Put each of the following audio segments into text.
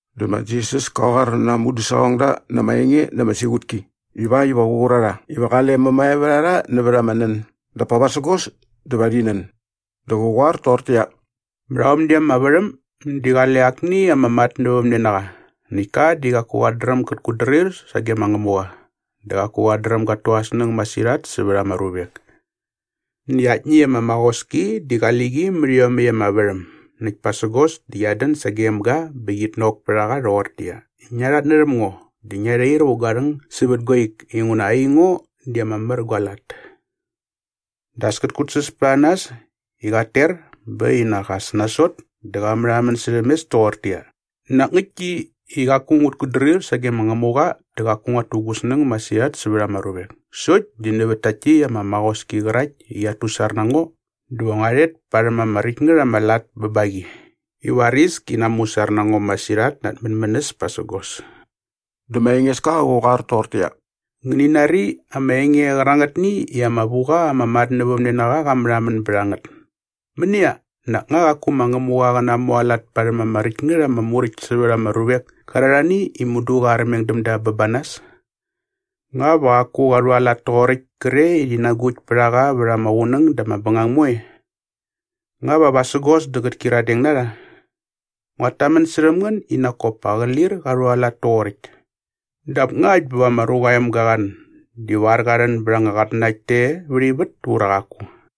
Dä ma Jisas ka qoar na aa mudäsaqongda na ama enge na ama siqutki ivakt iva qä qur a rha iva qale mämae vät a rha nävät ama nän dap pa vasägos dä va rhi nän. Dä qä qoar toqortäqyia, “Mät aomni ama värhäm di qale akni ama matnävämnenaqa näkt ka di qaku qat dräm gät kutdrir sage ma Ngämuqa dä qaku qat dräm gat tu aa snäng masirhat sävät ama ruvek. Näkt aktni ama maqoski di qali qi mät iomäkt ama värhäm näkt pasägos dä qiat dän sagem ga bä qit nok pät a qa rhoqortäqyia, ‘Ngia rhatnärhäm ngo dä ngia rhair vä gua rhäng sävät gua ik inguna aingo di ama mär gua lat.’” “Dä as kät kutsäs pät a nas i qat ter bä äkt bä nak as nasot dä qa märhamän särhäm mes toqortäqyia, ‘Nak ngäktki i qaku ngut kutdrir sage ma Ngämuqa dä qaku nguat tu gu snäng masirhat sävät ama ruvek sokt di nävät tärhakt ama maqoski qärakt i qiat tusar na ngo dä va ngua rhet parhäm ama räkt ngät ama lat bä ba qi i varis ki namusar na ngo masirhat na at mänmänäs pasägos.’” Dä ma Engeska qä qoar toqortäqyia, “Ngäni nari ama enge qärangätni i ama vu qa ama matnävämnenaqa qa märhamän bät a ngät. Mänia, nak nga qaku ma Ngämuqa qä namualat parhäm ama räkt ngät ama muräkt sävät aa ruvek kärarhani i mudu qa armeng däm da bä ba nas? Nga va qaku qa rhualat toqoräkt kre i rhi nagukt pät a qa vät ama qunäng dä ama bängang moe? Nga va vasägos dä qät kyiradeng na rha? Nguat tamän särhäm ngän i nak kop pa qä lir qa rhualat toqoräkt. Dap ngakt bä va ma Ruqa aa Emga qa rhän divar qa rhän bät anga qatnanakt te vät ivät ura qaku?”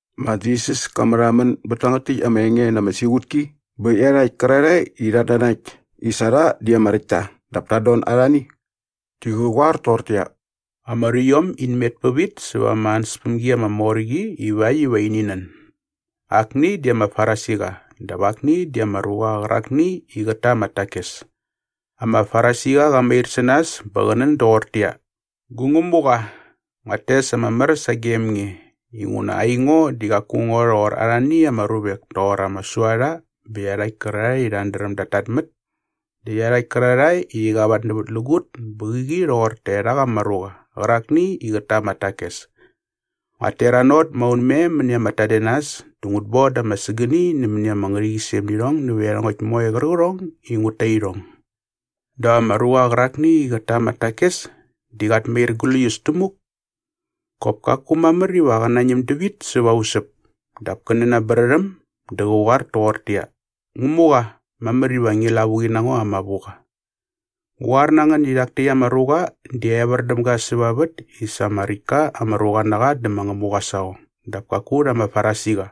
Ma Jisas ka märhamän bät tangät täkt ama enge na ama siqutki bä iarhakt kärarhae i rhat nanakt i sa rha di ama räkt ta dap tat don arhani. Di qä qoar toqortäqyia, “Ama ruiom in met pävit säva ama ansäspämgi ama mor qi ivakt iva ini nän. Akni di ama Farisiqa dap akni di ama ruqa qärakni i qät ta ama takes. Ama Farisiqa qa mair sä nas bä qä nän doqortäqyia, ‘Gu Ngämuqa, nguat tes ama mär sagem nge inguna aingo di qaku ngo rhoqor arhani ama ruvek toqor ama suarha bä iarhakt kärarhae i rhat dräm dat tatmät dä iarhakt kärarhae i rhi qavatnävätlägut bä qäqi rhoqor taerhak ama ruqa qärakni i qät ta ama takes. Nguat teranot maunmem mäni ama tadenas dä ngut boda ama sägäni nämäni ama ngärhäqyisem nä irhong nävät iarhongäkt moe qärqärhong i ngut ta irhong.’” “Dap ama ruqa qärakni i qät ta ama takes di qat mair gläius tämuk. Qop kaku mamär iva qä nañäm dävit säva usäp dap kä nän aa brärhäm dä qä qoar toqortäqyia, ‘Ngämuqa, mamär iva ngi lavuqi na ngo ama vuqa.’” “Ngu qoar na ngän i rhak täkt ama ruqa di evär däm ga säva vät i sa ama räkt ka ama ruqa na qa dä ma Ngämuqa aa saqong dap kaku rha ama Farisiqa.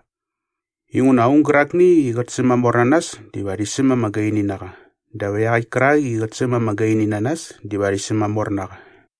Inguna aung gärakni i qät sämamor na nas diva rhi säm ama gaini na qa dap iaqäkt kärak i qät säm ama gaini na nas diva rhi sämamor na qa.”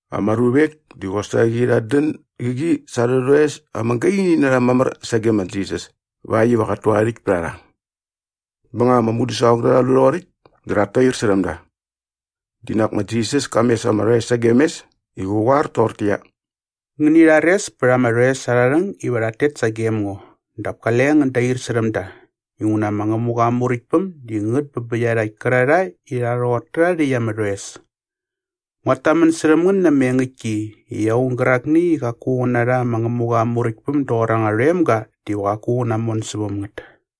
Ama ruvek di qosaqi rhat dän gäqi sa arhä rhoes ama gaini na rha mamär sage ma Jisas ivakt iva qat tu aa rhäkt pät a rha. Bä nga ama mudäsaqongda rha lu rhoqoräkt dä rhat tair särhäm da. Di nak ma Jisas ka mes ama rhoes sagem mes i qä qoar toqortäqyia, “Ngäni rhares pät ama rhoes arha rhäng iva rhat tet sagem ngo dap kale ngän dair särhäm da inguna ma Ngämuqa aa Muräktpäm di ngät bä bä iarhakt kärarhae i rha rhoqor tärha rhäkt ama rhoes. Nguat tamän särhäm ngän na ama engäktki i aung gärakni i qaku qä narha ma Ngämuqa aa Muräktpäm doqor anga rhoemga diva qaku qä namon säväm ngät.”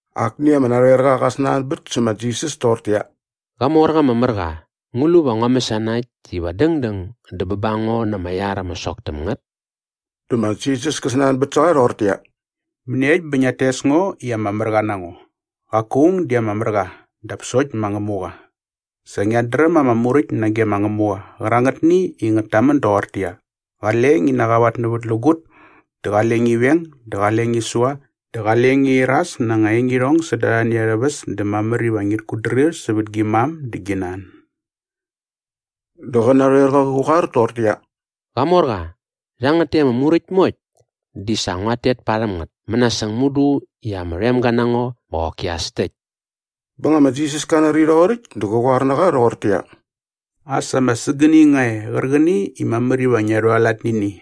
Akni ama narhoerqa qa snanbät sä ma Jisas toqortäqyia, “Qamorqa ama mär qa, ngu lu va ngua mäsana äkt iva dängdäng dä bä ba ngo na ama iar ama sok täm ngät?” Dä ma Jisas kä snanbät sä qa rhoqortäqyia, “Mäniekt bä ngiat tes ngo i ama mär qa na ngo? Qaku aung di ama mär qa dap sokt ma Ngämuqa. Sa ngiat dräm ama Muräkt nage ma Ngämuqa qärangätni i ngät tamän doqortäqyia, ‘Qale ngi qavatnävätlägut dä qale ngi veng dä qale ngi sua dä qale ngi iras na anga engirhong säda arhani arhä väs dä mamär iva ngit kutdrir sävät gi mam dä gi nan.’” Dä qä narhoerqa qä qoar toqortäqyia, “Qamorqa, rhangät täkt ama muräkt moekt di sa nguat tet parhäm ngät mänasäng mudu i ama rhoemga na ngo bä qoki as täkt.” Bä nga ma Jisas ka nari rhoqoräkt dä qa qoar na qa rhoqortäqyia, “As ama sägäni nga e qärqäni i mamär iva ngia rhualat nä ini.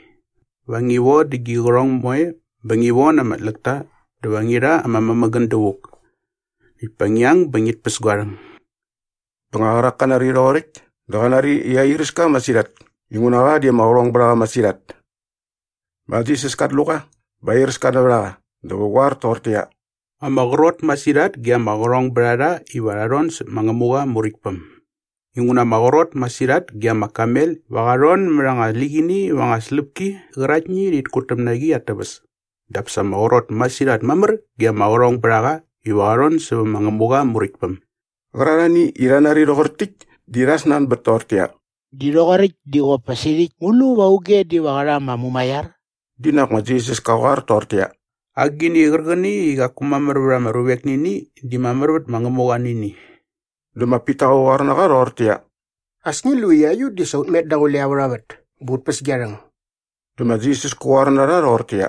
Va ngi vodä gi qärhong moe bä ngi von ama tläkta dä va ngi rha ama mämägän dävuk. Näkt pa ngi ang bä ngit päs gua rhäng.” Bä nga qärak ka nari rhoqoräkt dä qa nari i airäs ka masirhat inguna qa di ama qärhong bät a qa masirhat. Ma Jisas kat lu qa bä airäs ka nävät a qa dä qä qoar toqortäqyia, “Ama qrot masirhat ge ama qärhongbärharha iva rha rhon säp ma Ngämuqa aa Muräktpäm. Inguna ama qrot masirhat ge ama kamel iva qa rhon mät anga liqini va anga släpki qäraktni i rhit kutäm na qi at täväs dap sa ama qrot masirhat mamär ge ama qärhongbärhaqa iva qa rhon sävä ma Ngämuqa aa Muräktpäm.” Qärarhani i rha nari rhoqor täkt di rha snanbät toqortäqyia, “Di rhoqoräkt di qop pa sirhäkt ngu lu va auge diva qä rha ama mumaiar?” Dinak ma Jisas ka qoar toqortäqyia, “Agini qärqäni i qaku mamär vät ama ruvek nä ini di mamär vät ma Ngämuqa nä ini.” Dä ma Pita qä qoar na qa rhoqortäqyia, “As ngi lu i aiut di sa ut met daqule aurha vät bä ut päs gia rhäng.” Dä ma Jisas kä qoar na rha rhoqortäqyia,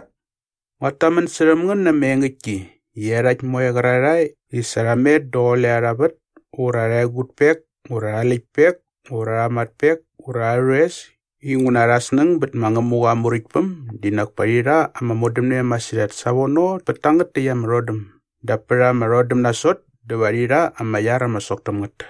“Nguat tamän särhäm ngän na ama engäktki i iarhakt moe qärarhae i sa rha met daqule arha vät ura arha egutpek ura arha läktpek ura arha matpek ura arhä rhoes inguna arhä snäng bät ma Ngämuqa aa Muräktpäm di nak pa rhi rha ama modämne masirhat savono pät tangät täkt ama rhodäm dap pät ama rhodäm nasot dä va rhi rha ama iar ama sok täm ngät.”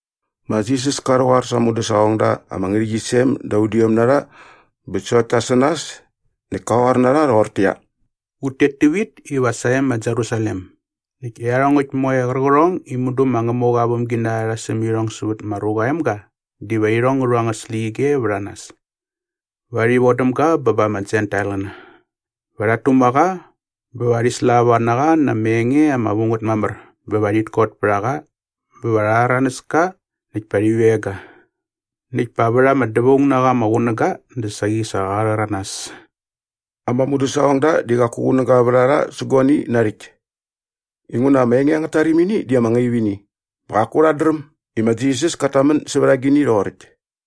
Ma Jisas ka rhäqoar sa aa mudäsaqongda ama ngärhäqyisem da udiom na rha bä sokt ta sä nas näkt ka qoar na rha rhoqortäqyia, “Ut tet tävit iva sae ma Jerusalem näkt iarhongäkt moe qärqärhong i mudu ma Ngämuqa aa vämginarha rha säm irhong sävät ma Ruqa aa Emga diva irhong ngä rhu angät släqyige vät a nas. Va rhi vodäm ga bä ba ama Jentailqäna. Va rhat tuma qa bä va rhi slava na qa na ama enge ama vu ngät mamär bä va rhit kot pät a qa bä va rha rhäranäs ka näkt pa rhi veng ga. Näkt pa vät ama dävaung na qa ama qunäga dä saqi sa qa rhäranas.” Ama mudäsaqongda di qaku qunäga vät a rha sä guani narhäkt. Inguna ama enge angät tarimini di ama ngaip ini bä qaku rhat dräm i ma Jisas kat tamän sävät agini rhoqoräkt.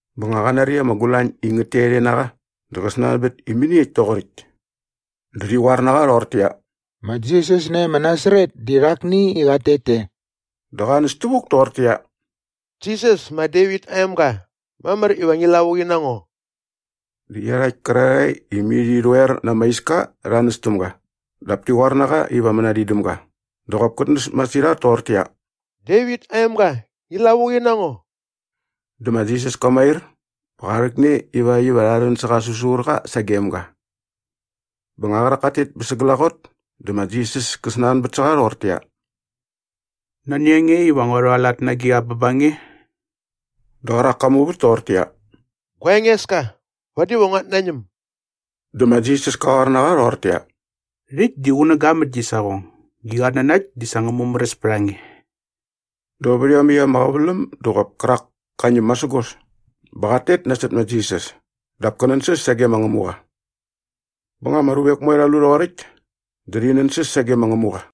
Bä nga qa nari ama gulañ i ngät tet e na qa dä qä snanbät i mäniekt toqoräkt. Dä rhi qoar na qa rhoqortäqyia, “Ma Jisas nae ma Nasaret di rhakni i qat tet te.” Dä qa näs tävuk toqortäqyia, “Jisas ma Devit aa emga, mamär iva ngi lavuqi na ngo!” Dä iarhakt kärarhae i mai rhi rhoer na ama iska rha näs täm ga dap ti qoar na qa iva mänadin däm ga dä qop kät näs masirhat toqortäqyia, “Devit aa emga, ngi lavuqi na ngo!” Dä ma Jisas ka mair bä qa rhäkne ivakt iva rha rhän sä qä säsurqa sagem ga. Bä nga qärak kat tet bä sa glaqot dä ma Jisas kä snanbät sä qa rhoqortäqyia, “Nani a nge iva ngua rhualat na agiqa bä ba nge?” Dä qärak ka muvät toqortäqyia, “Gua Engeska, vadi va nguat nañäm.” Dä ma Jisas ka qoar na qa rhoqortäqyia, “Rhäkt di qunäga mät gi saqong. Gi qatnanakt di sa ngä mumäräs pät a nge.” Dä vät iomäkt ama qäväläm dä qop kärak ka ñäm masägos bä qat tet nasot ma Jisas dap kä nänsäs sage ma Ngämuqa. Bä nga ama ruvek moe rha lu rhoqoräkt dä rhi nänsäs sage ma Ngämuqa.